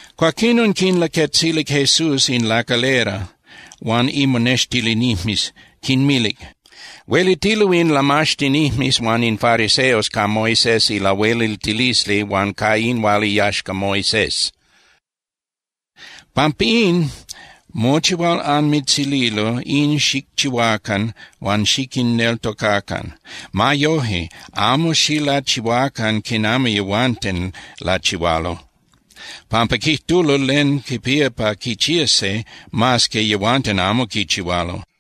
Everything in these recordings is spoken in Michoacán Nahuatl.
Cuaquinon quinlaquetzilic Jesús in lacalera huan imonextilinijmes, quinmilic: —Huelitilo in lamaxtinijmes huan in fariseos ca Moisés ilahueliltilisli huan ca in hual iyaxca Moisés. Pampín, mochi hual anmitzililo, in xicchihuacan huan xiquinneltocacan. Ma yoje, amo xilachihuacan quinami yehuanten lachihualo, pampa quijtulo len quipía pa quichías se, mas que yehuanten amo quichihualo.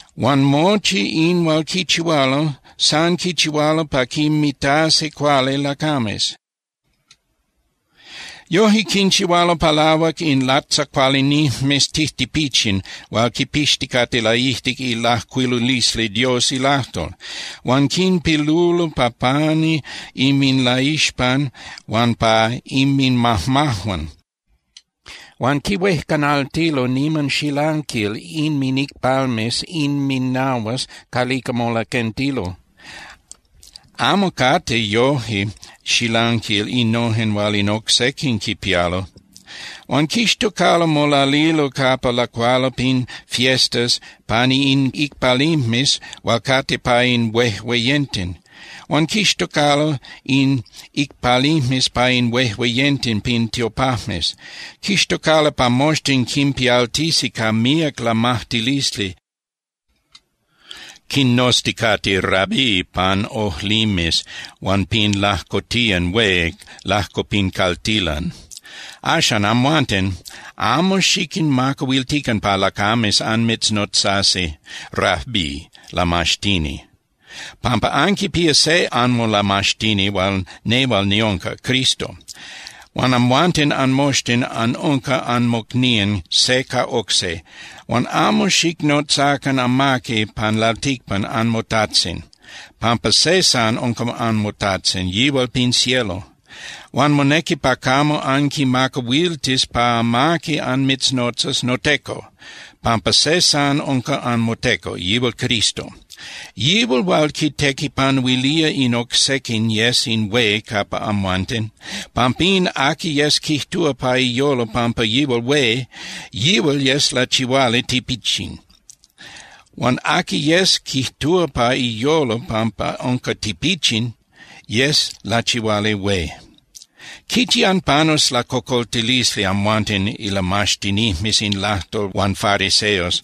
Huan mochi in hual quichihualo, san quichihualo pa quinmitasi cuali lacames. Yoje quinchihualo palahuac in latzacualinijmes tijtipichin hual quipixticate laijtic ilajcuilulisli Dios ilajtol, huan quinpilulo pa pani inminlaixpan huan pa inminmajmajuan. Huan quihuejcanaltilo niman xilanquil inminicpalmes inminahuas calica molaquentilo, amo cate yoje xilanquil innojen hual in oc sequin quipialo. Huan quixtocalo molalilo capa lacualo pin fiestas pani in icpalimes hual cate pa in huejueyenten. Huan quixtocalo in icpalimes pa in huejueyenten pin tiopajmes. Quixtocalo pa moxtin quinpialtisi ca míac lamajtilisli quinnozticate “Rabí” pan ojlimes huan pin lajcotiyan hué lajco pin caltilan. ’Axan, amhuanten, amo xiquinmacahuiltican pa lacames anmitznotzasi Rabí Lamaxtini, pampa anquipía se anmolamaxtini hual nehual niunca, Cristo. Huan amhuanten anmoxtin anunca anmocnían se ca oc se. Huan amo xicnotzacan amaqui pan lalticpan anmotajtzin, pampa se san unca anmoTajtzin, yihual pin cielo. Huan monequi pa camo anquimacahuiltis pa amaqui anmitznotzas “noteco”, pampa se san unca anmoteco, yihual Cristo. Yihual hual quitequipanuilía in oc sequin yes in hué capa amhuanten. Pampín, aqui yes quijtúa pa iyolo pampa yihual hué, yihual yes lachihuali tipichin. Huan aqui yes quijtúa pa iyolo pampa unca tipichin yes lachihuali hué. ’¡Quichi anpanus lacocoltilisli amhuanten ilamaxtinijmes in lajtol huan fariseos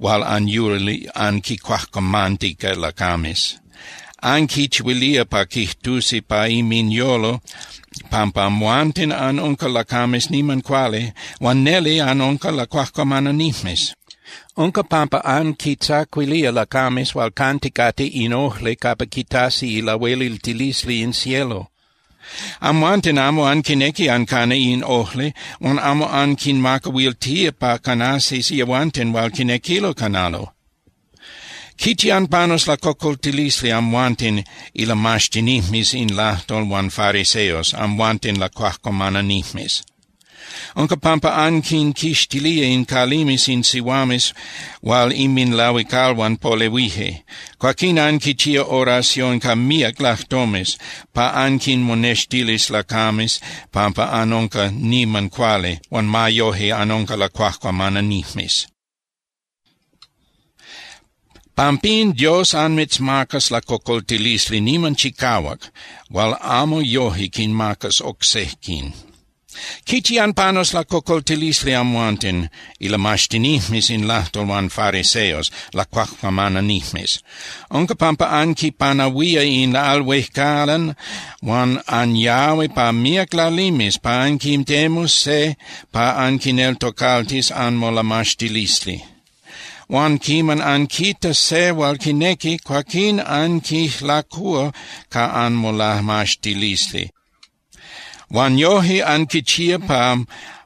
hual anyuli anquincuajcuamantica lacames! Anquichihuilía pa quijtusi pa inminyolo pampa amhuanten anunca lacames niman cuali, huan neli anunca lacuajcuamananijmes. Unca pampa anquitzacuilía lacames hual canticate in ojli capa quitasi ilahueliltilisli in cielo. Amhuanten amo anquinequi ancana in ojli huan amo anquinmacahuiltía pa canasi yehuanten hual quinequilo canalo. ’¡Quichi anpanus lacocoltilisli amhuanten, ilamaxtinijmes in lajtol huan fariseos, amhuanten lacuajcuamananijmes! Unca pampa anquinquixtilía in calimes in sihuames hual inminlahuicalhuan polehuije. Cuaquín anquichía oración ca míac lajtomes pa anquinmonextilis lacames pampa anunca niman cuali, huan ma yoje anunca lacuajcuamananijmes. Pampín, Dios anmitzmacas lacocoltilisli niman chicahuac hual amo yoje quinmacas oc sequin. ’¡Quichi anpanus lacocoltilisli amhuanten, ilamaxtinijmes in lajtol huan fariseos, lacuajcuamananijmes! Unca pampa anquipanahuía in al huejcalan huan anyahui pa míac lalimes pa anquitemus se pa anquineltocaltis anmolamaxtilisli. Huan quiman anquitas se hual quinequi, cuaquín anquijlacúa ca anmolamaxtilisli. Huan yoje anquichía pa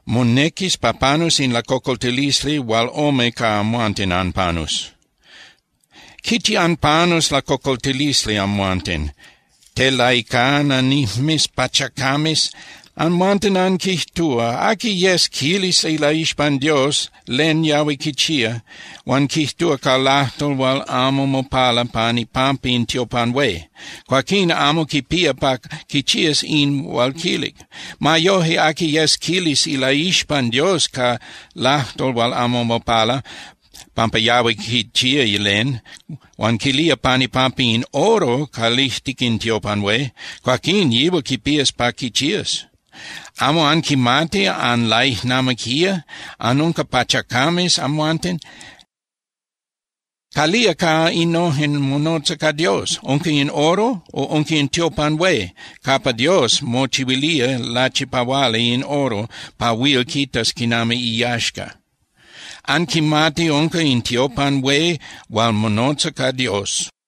monequis pa panus in lacocoltilisli hual ome ca amhuanten anpanus. ’¡Quichi anpanus lacocoltilisli amhuanten, telaicana nijmes pachacames! Amhuanten anquijtúa: “Aqui yes quilis ilaixpan Dios len yahui quichía, huan quijtúa ca lajtol hual amo mopala pan ipampa in tiopan hué, cuaquín amo quipía pa quichías in hual quilic. Ma yoje, aqui yes quilis ilaixpan Dios ca lajtol hual amo mopala pampa yahui quichía len, huan quilía pan ipampa in oro calijtic in tiopan hué, cuaquín yihual quipías pa quichías.” ¡Amo anquimati anlaijnamiquía, anunca pachacames, amhuanten! ¿Calía ca innojen monotza ca Dios? ¿Unca in oro, o unca in tiopan hué capa Dios mochihuilía lachipahuali in oro pa huil quitas quinami iyaxca? ¡Anquimati unca in tiopan hué hual monotza ca Dios!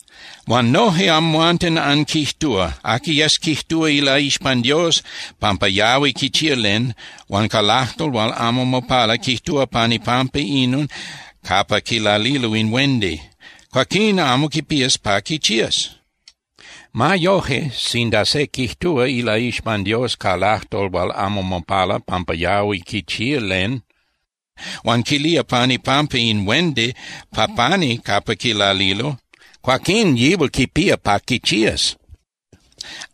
Huan noje amhuanten anquijtúa: “Aqui yes quijtúa ilaixpan Dios pampa yahui quichía len, huan ca lajtol hual amo mopala quijtúa pan ipampa inon capa quilalilo in huendi, cuaquín amo quipías pa quichías. Ma yoje, sinda se quijtúa ilaixpan Dios ca lajtol hual amo mopala pampa yahui quichía len, huan quilía pan ipampa in huendi pa pani capa quilalilo, cuaquín yihual quipía pa quichías.”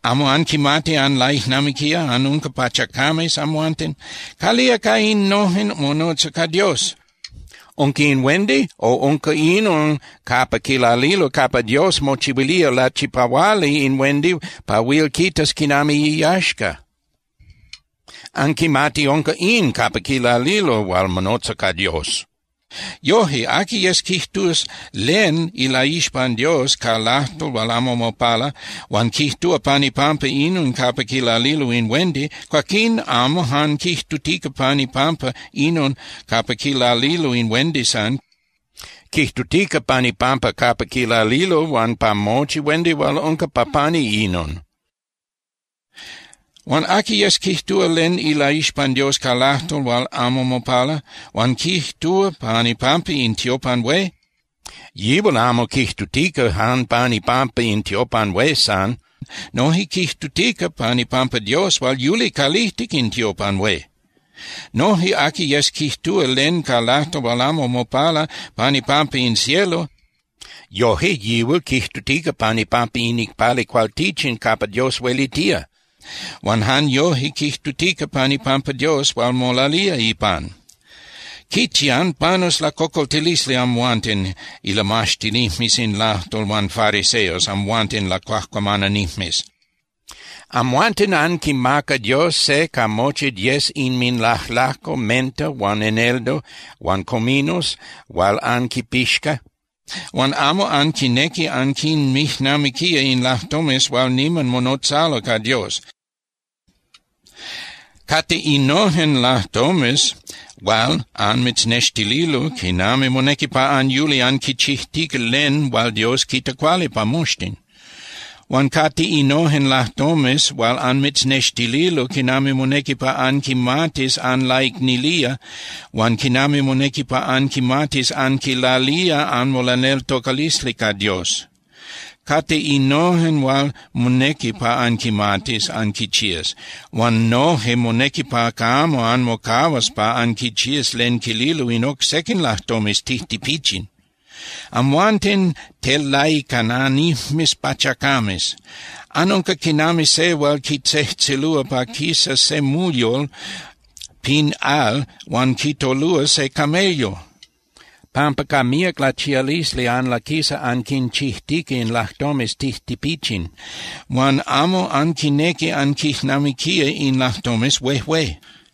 ¡Amo anquimati anlaijnamiquía, anunca pachacames, amhuanten! ¿Calía ca innojen monotza ca Dios? ¿Unca in huendi, o unca inon capa quilalilo capa Dios mochihuilía lachipahuali in huendi pa huil quitas quinami iyaxca? ¡Anquimati unca in capa quilalilo hual monotza ca Dios! Yoje, aqui yes quijtus len ilaixpan Dios ca lajtol hual amo mopala, huan quijtúa pan ipampa inon capa quilalilo in huendi, cuaquín amo jan quijtutica pan ipampa inon capa quilalilo in huendi san. Quijtutica pan ipampa capa quilalilo huan pa mochi huendi hual unca pa pani inon. Huan aqui yes quijtúa len ilaixpan Dios ca lajtol hual amo mopala, huan quijtúa pan ipampa in tiopan hué, yihual amo quijtutica jan pan ipampa in tiopan hué san. Noje quijtutica pan ipampa Dios hual yuli calijtic in tiopan hué. Noje aqui yes quijtúa len ca lajtol hual amo mopala pan ipampa in cielo, yoje yihual quijtutica pan ipampa in icpali cualtichin capa Dios huelitía huan jan yoje quijtutica pan ipampa Dios hual molalía ipan. ’¡Quichi anpanus lacocoltilisli amhuanten, ilamaxtinijmes in lajtol huan fariseos, amhuanten lacuajcuamananijmes! Amhuanten anquimaca Dios se ca mochi diez inminlajlajco menta huan eneldo huan cominos hual anquipixca, huan amo anquinequi anquinmijnamiquía in lajtomes hual niman monotzalo ca Dios. Cate innojen lajtomes hual anmitznextililo quinami monequi pa anyuli anquichijtica len hual Dios quita cuali pa moxtin. Huan cate innojen lajtomes hual anmitznextililo quinami monequi pa anquimatis anlaicnilía huan quinami monequi pa anquimatis anquilalía anmolaneltocalisli ca Dios. Cate innojen hual monequi pa anquimatis anquichías. Huan noje monequi pa camo anmocahuas pa anquichías len quililo in oc sequin lajtomes tijtipichin. ¡Amhuanten telaicananijmes pachacames! Anunca quinami se hual quitzejtzelúa pa quisas se muyol pin al huan quitolúa se camello, pampa ca míac lachialisli anlaquisa anquichijtica in lajtomes tijtipichin huan amo anquinequi anquijnamiquía in lajtomes huejué.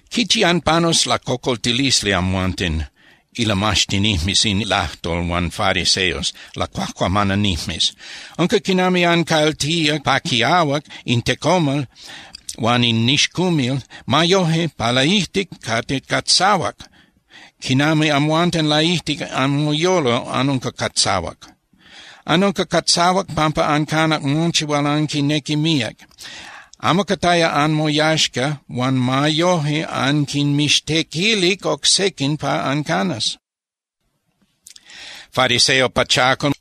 ’¡Quichi anpanus lacocoltilisli amhuanten, ilamaxtinijmes in lajtol huan fariseos, lacuajcuamananijmes! Unca quinami ancaltía pa quiahuac in tecomal huan in nixcumil. Ma yoje, pa laijtic cate catzahuac, quinami amhuanten laijtic anmoyolo anunca catzahuac. Anunca catzahuac pampa ancanac mochi hual anquinequic míac. Amo cataya anmoyaxca huan ma yoje anquinmixtequilic oc sequin pa ancanas. Fariseo pachacal,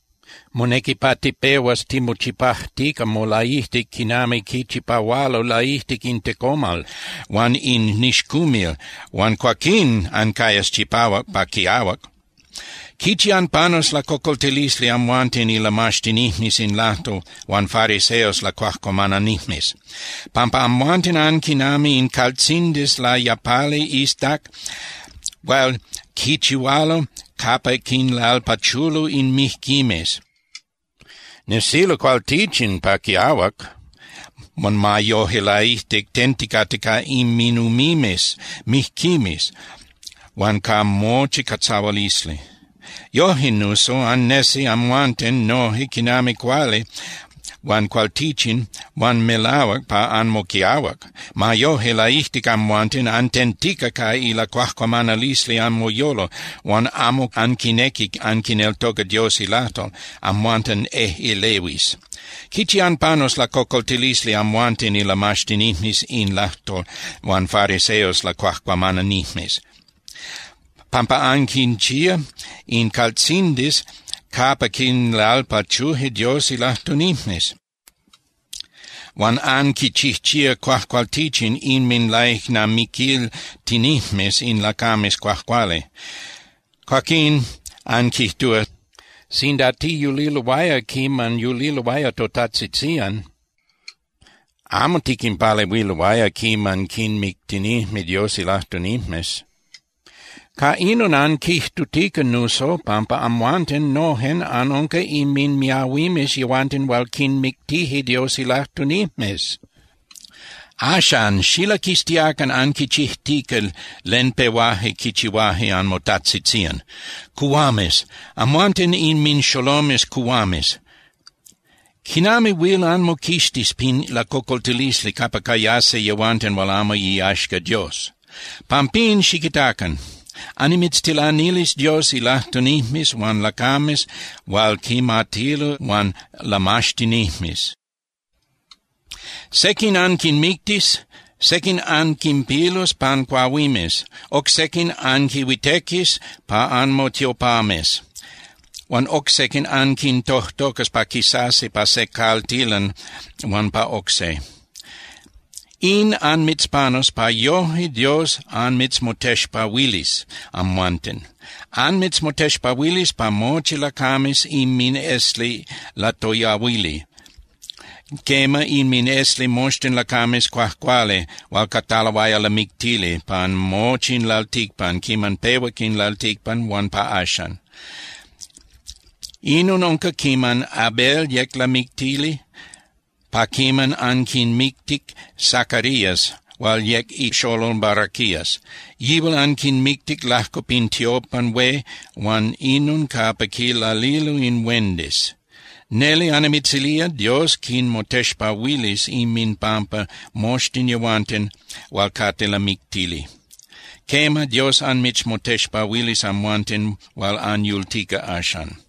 monequi pa tipehuas timochipajtica molaijtic quinami quichipahualo ilaijtic in tecomal huan in nixcumil huan cuaquín ancayas chipahuac pa quiahuac. ’¡Quichi anpanus lacocoltilisli amhuanten ilamaxtinijmes in lajtol huan fariseos lacuajcuamananijmes!, pampa amhuanten anquinami in caltzindis layapali iztac hual quichihualo capa quinlalpachulo in mijquimes. Nesilo cualtichin pa quiahuac, huan ma yoje laijtic tenticate ca inminumimes mijquimes huan ca mochi catzahualisli. Yoje nuso annesi amhuanten noje quinami cuali huan cualtichin huan melahuac pa anmoquiahuac. Ma yoje, laijtic amhuanten antentica ca ilacuajcuamanalisli anmoyolo huan amo anquinequi anquineltoca Dios ilajtol, amhuanten ejꞌelehuis. ’¡Quichi anpanus lacocoltilisli amhuanten ilamaxtinijmes in lajtol huan fariseos lacuajcuamananijmes! Pampa anquinchía in caltzindis capa quinlalpachuje Dios ilajtunijmes, huan anquichijchía cuajcualtichin inminlaijnamiquiltinijmes in lacames cuajcuali. Cuaquín anquijtúa: “Sinda tiyuliloaya quiman yuliloaya totajtzitzían, amo tiquinpalehuiloaya quiman quinmictinijme Dios ilajtunijmes.” Ca inon anquijtutica nuso pampa amhuanten nojen anunca inminmiahuimes yehuanten hual quinmictije Dios ilajtunijmes. Axan ¡xilaquistiacan anquichijtica len pehuaje quichihuaje anmotajtzitzían! ’¡Cuhuames! ¡Amhuanten inminxolomes cuhuames! ¡Quinami huil anmoquixtis pin lacocoltilisli capa cayasi yehuanten hual amo iyaxca Dios! Pampín, xiquitacan. Annimitztilanilis Dios ilajtunijmes huan lacames hual quimatilo huan lamaxtinijmes. Sequin anquinmictis, sequin anquinpilus pan cuahuimes. Oc sequin anquinhuitequis pa anmotiopames huan oc sequin anquintojtocas pa quisasi pa se caltilan huan pa oc se. In anmitzpanus pa yoje Dios anmitzmotexpahuilis amhuanten. Anmitzmotexpahuilis pa mochi lacames inminesli latoyahuili, quema, inminesli moxtin lacames cuajcuali hual cataloaya lamictili pan mochi in lalticpan quiman pehuac in lalticpan huan pa axan. Inon unca quiman Abel yec lamictili pa quiman anquimictic Zacarías hual yec ixolol Baraquías. Yihual anquimictic lajco pin tiopan hué huan inon capa quilalilo in huendis. Neli annimitzilía, Dios quinmotexpahuilis inminpampa moxtin yehuanten hual cate lamictili. Quema, Dios anmitzmotexpahuilis amhuanten hual anyultica axan.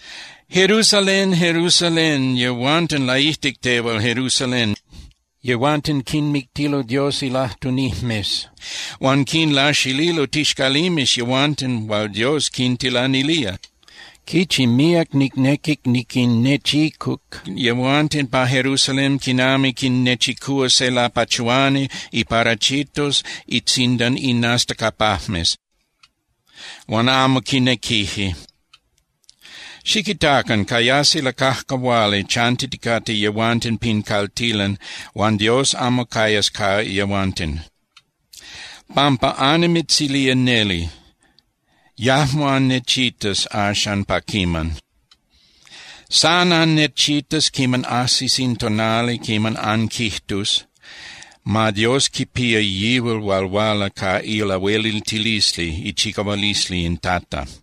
’¡Jerusalén, Jerusalén! Yehuanten laijtic tehual, Jerusalén, yehuanten quinmictilo Dios ilajtunijmes huan quinlaxililo tixcalimes yehuanten hual Dios quintilanilía. ¡Quichi míac nicnequic niquinnechicuc yehuanten pa Jerusalén quinami quinnechicúa se lapachuani iparachitos itzindan inastacapajmes huan amo quinequije! Xiquitacan. Cayasi lacajcahuali chantiticate yehuanten pin caltilan huan Dios amo cayas ca yehuanten. Pampa annimitzilía neli, yajmo annechitas axan pa quiman. San annechitas quiman ajsis in tonali quiman anquijtus: “Ma Dios quipía yihual hual huala ca ilahueliltilisli, ichicahualisli in Tata.”